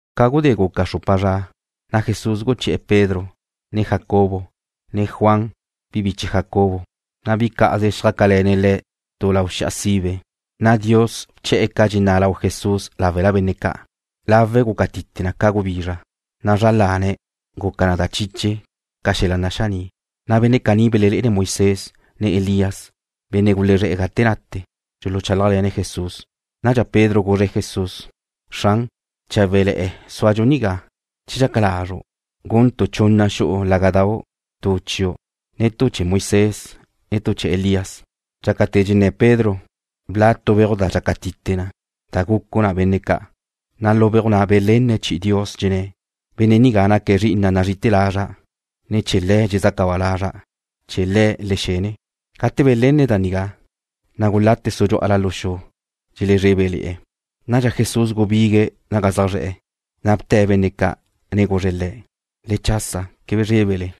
Ca gudé guca xrupa zra, na' Jesús guché̱'e̱ Pedro, ne Jacobo, ne Juan, bi biche Jacobo, na' bi cá'aze xjácale̱ne̱' Le̱' tu lau xi'a sibe. Na' Dios bche̱'e̱ ca dxenná' lau Jesús láwela benne' ca'. Lawe̱' guca tite na ca gubizra, na' zra lane̱' guca na da chiche ca xel-la' naxaní'. Na' benne' caní belelé'ene̱' Moisés, ne Elías, benne' gulezrá' gate nate, dxuluchálajle̱ne̱' Jesús. Nadxa Pedro guzre̱' Jesús: ―Xran, cháwe'le̱'e̱ zúadxu nigá. Che dxaca lazru', guntu' chunna xu'u lágadau', tu chiu', ne tu chee̱ Moisés, ne tu chee̱ Elías. Dxácate̱ dxenné̱ Pedro, bla' tu beuj da dxaca tite na, da gucu na benne' ca', na' lu beuj na' belenne̱' chi'i Dios, dxenné̱': ―Benne' nigá naque̱' Zri'ina' nazrí'ite̱ lazra', ne chee̱ Le̱' dxezaca ba lazra'. Chee̱ Le̱' le xene. Gate belenne̱' da nigá, na' gulate̱' sudxú'ala lu xu. Dxelezrébele̱'e̱. Nadxa Jesús gubigue̱' naga zaj zre̱'e̱, na' bte̱' benne' ca', ne guzre̱' le̱': ―Le chasa. Quebe zrébele.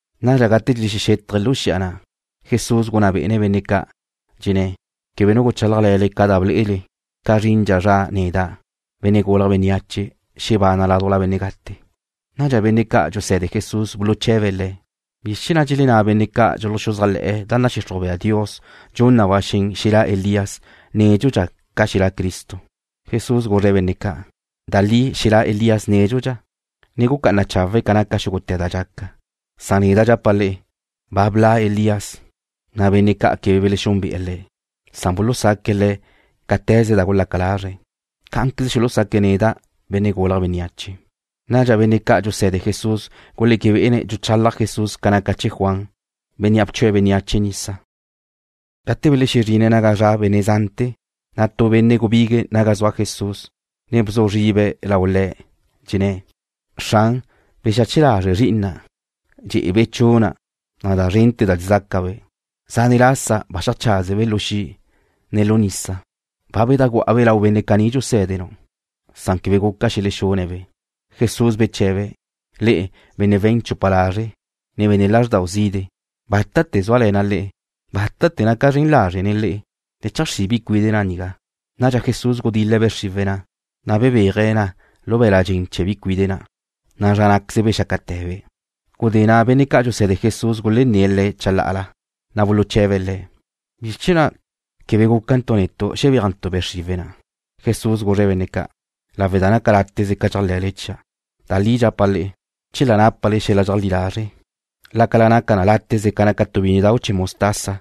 Nadxa gate dxelexexétaje̱' lu xi'a na', Jesús gunná bé'ene̱' benne' ca', dxenné̱': ―Quebe nu guchálajle̱le ca da ble'ele ca zrindxa zra neda', Benne' Gulje̱' Bénneache, xebana' ládujla benne' gate. Nadxa benne' ca' dxuse̱de Jesús buluche̱be̱' Le̱': ―¿Bizr chee̱ na' dxelenná benne' ca' dxuluxuzájle̱'e̱ da nadxixruj bea Dios dxun na ba xen xelá' Elías nédxudxa ca xelá' Cristo? Jesús guzre̱' benne' ca': ―Da li xelá' Elías nédxudxa, ne gucá'ana chawe̱' ca naca da dxal-la' gaca. Neda' dxapa' le'e, ba bla' Elías, na' benne' ca' quebe belexúnbe'e̱ le̱'. Bulusaque̱' le̱' cáte̱ze da gulaca lazre̱'. Cá'anqueze xulusaque̱' neda', Benne' Gulje̱' Bénneache. Nadxa benne' ca' dxuse̱de Jesús guléque be'ene̱' dxuchalaj Jesús ca naca chee̱ Juan, bénnea' bchue̱' bénneache nisa. Gate belezrine̱' naga zaj zra' benne' zante̱, na' tu benne' gubigue̱' naga zua Jesús, ne bzu zribe̱' lau Le̱', dxenné̱': ―Xran, bexache lazre' zri'ina', dxe'ebe' chuna', ne da zrente̱ da dxezácabe'. Zánete̱ lasa ba xeajcházebe' lu xi', ne lu nisa. Ba bedajgu'a-be' lau benne' caní dxusé̱denu', na' quebe guca xelexune̱'-be'. Jesús beche̱be̱': ―Le'e, benne' we̱n chupa lazre', ne benne' lázrdau zide'. ¿Bátate̱ zúale̱na' le'e? ¿Bátate̱ naca' zren lazre' nen le'e? Le cheajxrí' bi cuide' na' nigá. Nadxa Jesús gudil-le̱' be' xriwe̱' na', na' bebéaje̱' na lu be̱l-la' dxen chee̱ bi cuide' na', na' zra ná'queze bexácate̱be'. Gudé na' benne' ca' dxuse̱de Jesús gulenné̱' Le̱' chalá'ala, na' buluche̱be̱' Le̱': ―¿Bizr chee̱ na' quebe guca netu' xebéajntu' be' xriwe̱' na'? Jesús guzre̱' benne' ca': ―Lawe' da naca láteze ca dxéajle̱le chia'. Da li dxapa' le'e, che la nápale xel-la' dxeajlí lazre', lácala naca na láteze ca naca tu bínnedau' chee̱ mostaza,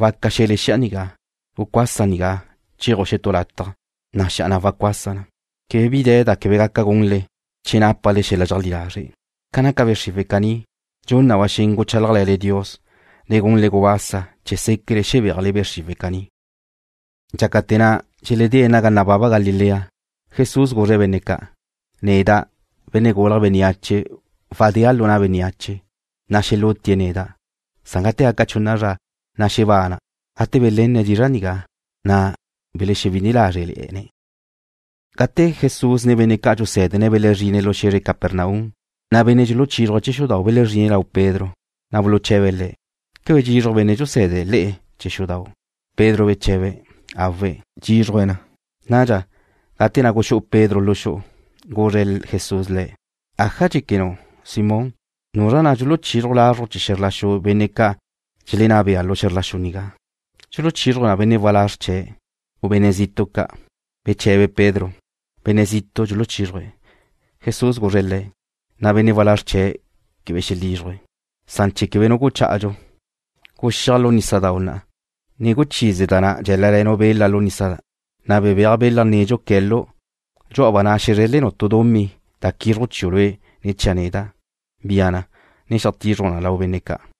waca xe̱le xi'a nigá: “Gucuasa nigá chéaju' xetú lataj”, na' xi'a na' wacuasa na. Quebe bi de̱ da quebe gaca gunle che nápale xel-la' dxeajlí lazre'. Ca naca be' xriwe̱' caní, dxun na ba xen guchálajle̱le Dios, ne gunle gubasa chee̱ séquele xebéajle be' xriwe̱' caní. Dxácate̱ na' dxeledé̱' naga nababa Galilea, Jesús guzre̱' benne' ca': ―Neda', Benne' Gulje̱' Bénneache wadéa' lu na' bénneache. Xelútie̱' neda', na' gate gaca chunna zra, xebana'. Gate belenne̱' dizra' nigá, na' bewi'ine lázrele̱'e̱ne̱'. Gate Jesús ne benne' ca' dxusé̱dene̱' belezrine̱' lu xe̱zre Capernaum, na' benne' dxuluchízruje̱' chee̱ xudau' belezrine̱' lau Pedro, na' buluche̱be̱' le̱': ―¿Quebe dxizruj benne' dxusé̱dene̱' le'e chee̱ xudau'? Pedro beche̱be̱': ―Awe'. Dxízruje̱' na. Nadxa, gate na' guxú'u Pedro lu xu'u, guzre Jesús le̱': ―¿Aja dxéquenu', Simón? ¿Nuzra na' dxuluchizruj lazruj chee̱ xe̱zr la xu benne' ca' dxelenná bea lu xe̱zr la xu nigá? ¿Dxuluchízruje̱' benne' walázr chee̱', u benne' zitu' ca'? Beche̱be Pedro: ―Benne' zitu' dxuluchízruje̱'. Jesús guzre̱' le̱': ―Na' benne' walázr chee̱' quebe xelízruje̱'. Na'a, chee̱ quebe nu guchá'adxu, guxíaj lu nísadau' na', ne guchize da na' dxeláleu' bela lu nisa na', na' bebéaj bela nedxu que̱lu'-ba'. Dxú'aba' na' xezrelnu' tu dumí da quízruju' chiu' lue', ne chia' neda'. Bia na, ne xeajtizruj na lau benne' ca'.